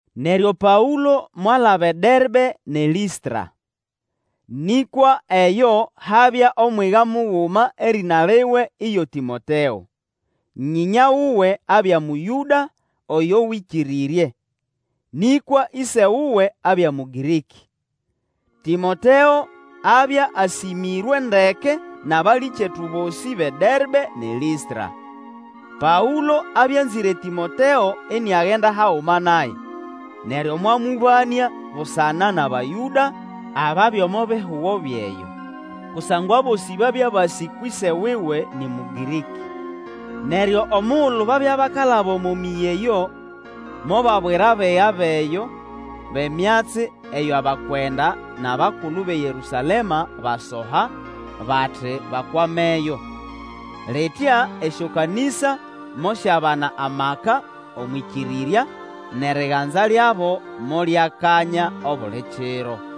Neryo Paũlo mwalaba eDerbe nʼeLĩstra. Nĩkwa eyo habya omwiga muguma erĩna liwe iyo Tĩmoteo. Nyĩnya wuwe abya Mũyũda oyo Wĩkĩrĩrye, nĩkwa ĩse wuwe abya Mũgĩrĩkĩ. Tĩmoteo abya asĩmĩrwe ndeke nʼabalĩkyetu bosĩ bʼeDerbe nʼeLĩstra. Paũlo abya anzĩre Tĩmoteo iniagenda haguma naye, neryo mwamũbanĩa busana nʼAbayũda ababya omo bihugo byʼeyo, kusangwa abosĩ babya basĩ kwʼĨse wuwe nĩ Mũgĩrĩkĩ. Neryo omugulu babya bakalaba omo mĩyĩ eyo, mobabwira abiga bʼeyo bʼemyatsi eyo bakwenda nʼabakulu bʼeYerũsalema basoha, bati bakwameyo. Litya esyokanĩsa mosyabana amaka omwʼĩkĩrĩrya, nʼeriganza lyabo molyakanya obuli kiro.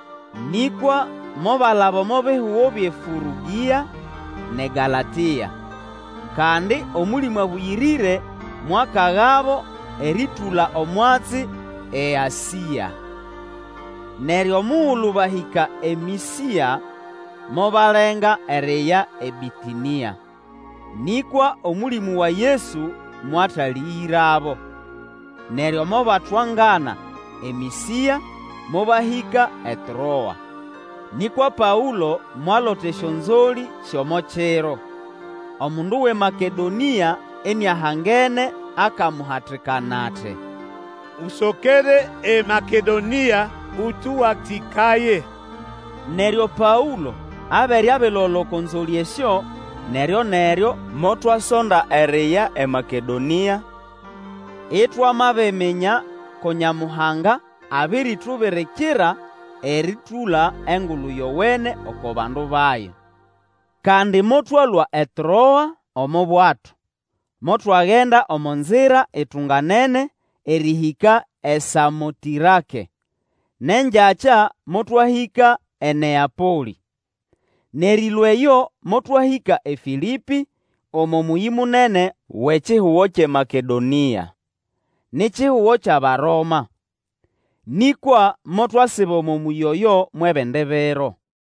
Nĩkwa mobalaba omo bihugo byʼeFũrũgĩa nʼeGalatĩa. Kandi Omũlĩmũ Abũyĩrĩre mwakagabo erĩtũla omwatsi eAsĩa. Neryo mugulu bahĩka eMĩsĩa, mobalenga eriya eBĩtĩnĩa, nĩkwa Omũlĩmũ wa Yesu mwatalĩgĩrabo. Neryo mobatwangana eMĩsĩa, mobahĩka eTroa. Nĩkwa Paũlo mwalota esyonzolĩ syʼomo kiro. Omundu wʼeMakedonĩa iniahangene akamuhatikana ati, Usokere eMakedonĩa ũtũwatĩkaye! Neryo Paũlo abere abilola oko nzolĩ esyo, neryo-neryo motwasonda eriya eMakedonĩa, itwamabiminya ko Nyamuhanga abirimbirikira erĩtũla Engulu Yowene oko bandu bayo. Kandi motwalũa eTroa omo bwato, motwagenda omo nzira itunganene erĩhĩka eSamotĩrake, nʼengyakya motwahĩka eNeapolĩ. Nʼerĩlũa eyo motwahĩka eFĩlĩpĩ, omo mũyĩ munene wʼekihugo kyʼeMakedonĩa. Ni kihugo kyʼAbaroma. Nĩkwa motwasiba omo mũyĩ oyo mwʼebindi biro.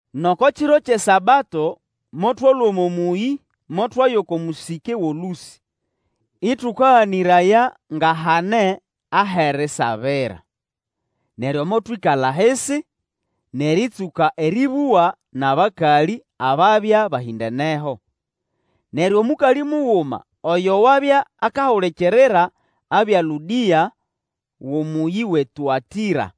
Nʼoko kiro kyʼeSabato motwalũa omo mũyĩ motwaya oko mũsĩke wʼolũsĩ, ĩtũkaganĩraya nga hane ahʼerisabira. Neryo motwĩkala ahisi, nʼerĩtsũka erĩbũga nʼabakalĩ ababya bahĩndeneho. Neryo omũkalĩ muguma oyo wabya akahulikirira, abya Lũdĩa wʼomũyĩ wʼeTuatira.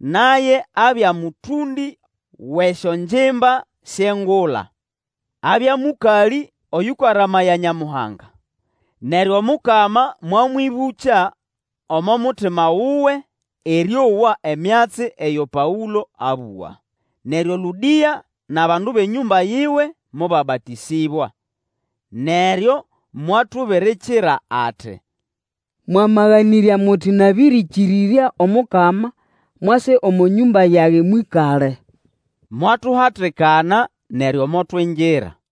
Naye abya mũtũndĩ wʼesyongimba syʼengula. Abya mũkalĩ oyũkaramaya Nyamuhaga, neryo Omukama mwamwĩbũkya omo mutima wuwe erĩowa emyatsi eyo Paũlo abũga. Neryo Lũdĩa nʼabandu bʼenyũmba yiwe mobabatĩsĩbwa. Neryo mwatubirikira ati, Mwamaganĩrya muti nabĩrĩkĩrĩrya Omukama, mwase omo nyũmba yage mwĩkale. Mwatuhatikana, neryo motwingira.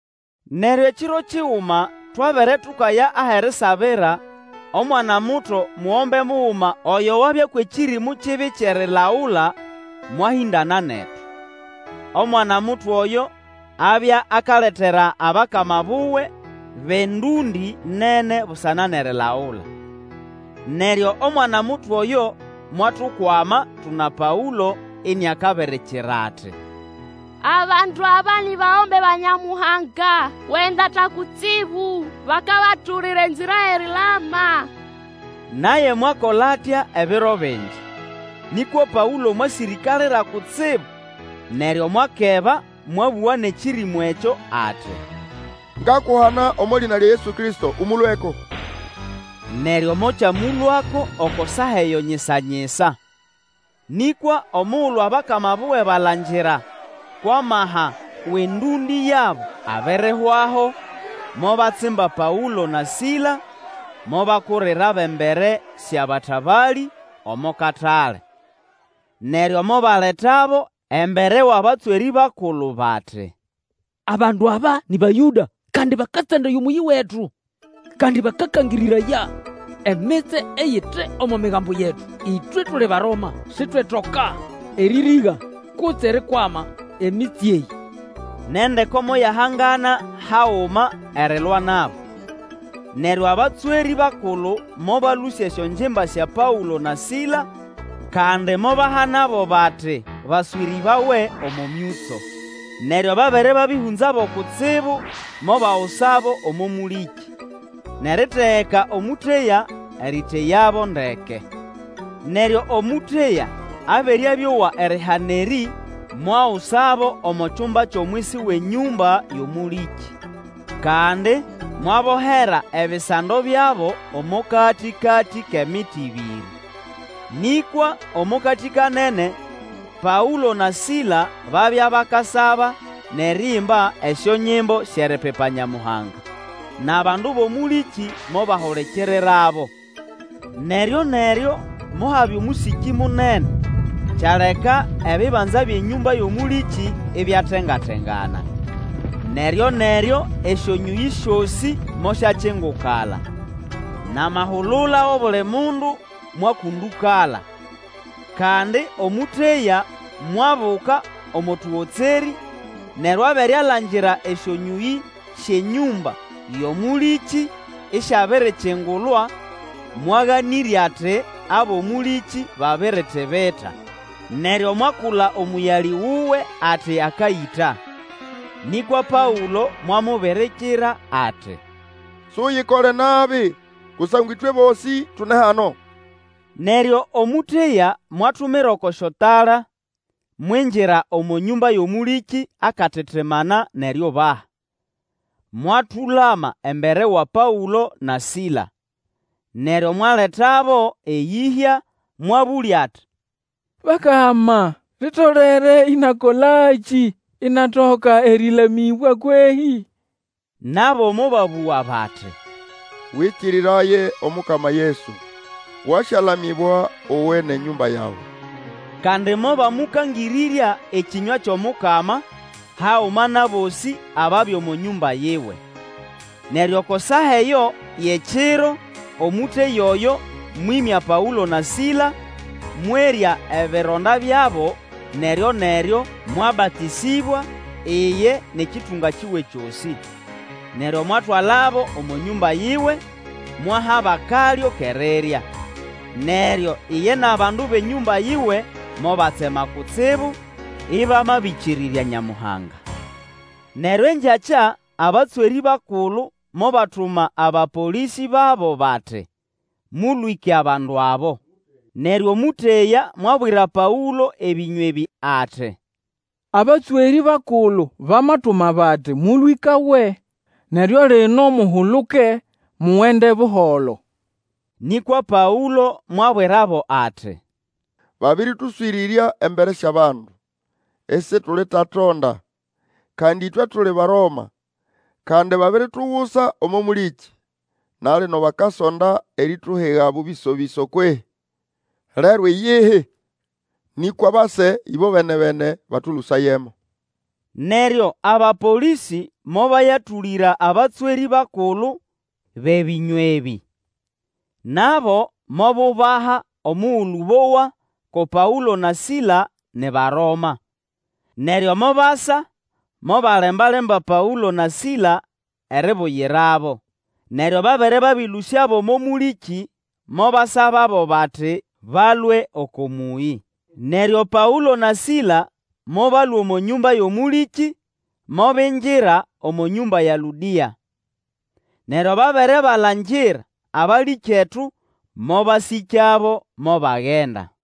Neryo ekiro kiguma twabere tukaya ahʼerisabira, omwana-muto mugombe muguma oyo wabya kwʼekĩrĩmũ kibi kyʼerilagula, mwahĩndana netu. Omwana muto oyo abya akaletera abakama buwe bʼendũndĩ nene busana nʼerilagula. Neryo omwana-muto oyo mwatukwama tuna Paũlo iniakabirikira ati, Abandu aba ni bagombe ba Nyamuhanga Wʼendata Kutsibu! Bakabatũlĩra enzira yʼerilama! Naye mwakola atya ebiro bingi. Nĩkwa Paũlo mwasĩrĩkalira kutsibu, neryo mwakeba mwabũga nʼekĩrĩmũ ekyo ati, Ngakuhana omo lĩna lya Yesu Kristo ũmũlũeko! Neryo mokyamũlũako oko saa eyo nyisa-nyisa. Nĩkwa omugulu abakama buwe balangira kwʼamaha wʼendũndĩ yabo abirihwaho, mobatsimba Paũlo na Sila mobakurirabo embere syʼabatabalĩ omo katale. Neryo mobaletabo embere wʼabatswerĩ bakulu bati, Abandu aba nĩ Bayũda kandi bakatsandaya omũyĩ wetu. Kandi bakakangĩrĩraya emitsye eyite omo migambo yetu. Ĩtwe tuli Baroma, sitwetoka erĩrĩga kutse erikwama emitsye eyĩ. Nʼendeko moyahangana haguma erilwa nabo. Neryo abatswerĩ bakulu mobalũsya esyongimba sya Paũlo na Sila, kandi mobahana bati baswĩrĩbawe omo myũtso. Neryo babere babĩhũnzabo kutsibu, mobagusabo omo mũlĩkĩ, nʼeritegeka omũteya erĩteyabo ndeke. Neryo omũteya abere abĩowa erihana erĩ, mwagusabo omo kyumba kyʼomwisi wʼenyũmba yʼomũlĩkĩ, kandi, mwabohera ebisando byabo omo katĩkatĩ kʼemiti ĩbĩrĩ. Nĩkwa omo katĩ kanene, Paũlo na Sila babya bakasaba nʼeriimba esyonyimbo syʼeripipa Nyamuhanga, nʼabandu bʼomũlĩkĩ mobahulikirirabo. Neryoneryo mohabya omũsĩkĩ munene, kyaleka ebibanza byʼenyũmba yʼomũlĩkĩ ibyatenga-tengana. Neryo-neryo esyonyũyĩ syosĩ mosyakingukala, nʼamahulula wʼobuli mundu mwakũndũkala. Kandi omũteya mwabuka omo tũgotserĩ, neryo abere alangira esyonyũyĩ syʼenyũmba yʼomũlĩkĩ isyabirikingulwa mwaganĩrya ati abʼomũlĩkĩ babiritibita, neryo mwakula omũyalĩ wuwe ati akayĩta. Nĩkwa Paũlo mwamubirikira ati, Suyikole nabi kusangwa ĩtwe bosĩ tune hano! Neryo omũteya mwatumira oko syotala, mwingira omo nyũmba yʼomũlĩkĩ akatitimana nʼeriubaha, mwatũlama embere wa Paũlo na Sila. Neryo mwaletabo eyĩhya, mwabũlya ati, Bakama, litolere ĩnakolakĩ inatoka erĩlamĩbwa kwehĩ? Nabo mobabũga bati, Wĩkĩrĩraye Omukama Yesu, wasyalamĩbwa uwe nʼenyũmba yawe. Kandi mobamũkangĩrĩrya ekĩnywa kyʼomukama, haguma nʼabosĩ ababya omo nyũmba yiwe. Neryo oko saa eyo yʼekiro, omũteya oyo mwĩmya Paũlo na Sila, mwerya ebironda byabo, neryoneryo mwabatĩsĩbwa, iye nʼekĩtũnga kiwe kyosĩ. Neryo mwatwalabo omo nyũmba yiwe, mwahabo akalyo kʼerirya. Neryo iye nʼabandu bʼenyũmba yiwe mobatsema kutsibu, ĩbamabĩkĩrĩrya Nyamuhanga. Neryo engyakya, abatswerĩ bakulu mobatuma abapolĩsĩ babo bati, Mũlwĩke abandu abo. Neryo mũteya mwabwira Paũlo ebĩnywa ebĩ ati, Abatswerĩ bakulu bamatuma bati mũlwĩkawe. Neryo lino muhuluke mugende buholo. Nĩkwa Paũlo mwabwirabo ati, Babĩrĩtũswĩrĩrya embere syʼabandu, isitulitwatonda. Kandi ĩtwe tuli Baroma! Kandi babiritugusa omo mũlĩkĩ. Na lino bakasonda erituhiga bũbĩso-bĩso kwehĩ? Lero iyihi! Nĩkwa base ĩbobene-bene batũlũsayemo. Neryo abapolĩsĩ mobayatũlĩra abatswerĩ bakulu bʼebĩnywa ebĩ. Nabo mobubaha omugulu bowa ko Paũlo na Sila ni Baroma. Neryo mobasa mobalemba-lemba Paũlo na Sila eribuyirabo, neryo babere balũsyabo omo mũlĩkĩ, mobasababo bati balũe oko mũyĩ. Neryo Paũlo na Sila mobalũa omo nyũmba yʼomũlĩkĩ, mobingira omo nyũmba ya Lũdĩa. Neryo babere balangira abalĩkyetu, mobasĩkyabo, mobagenda.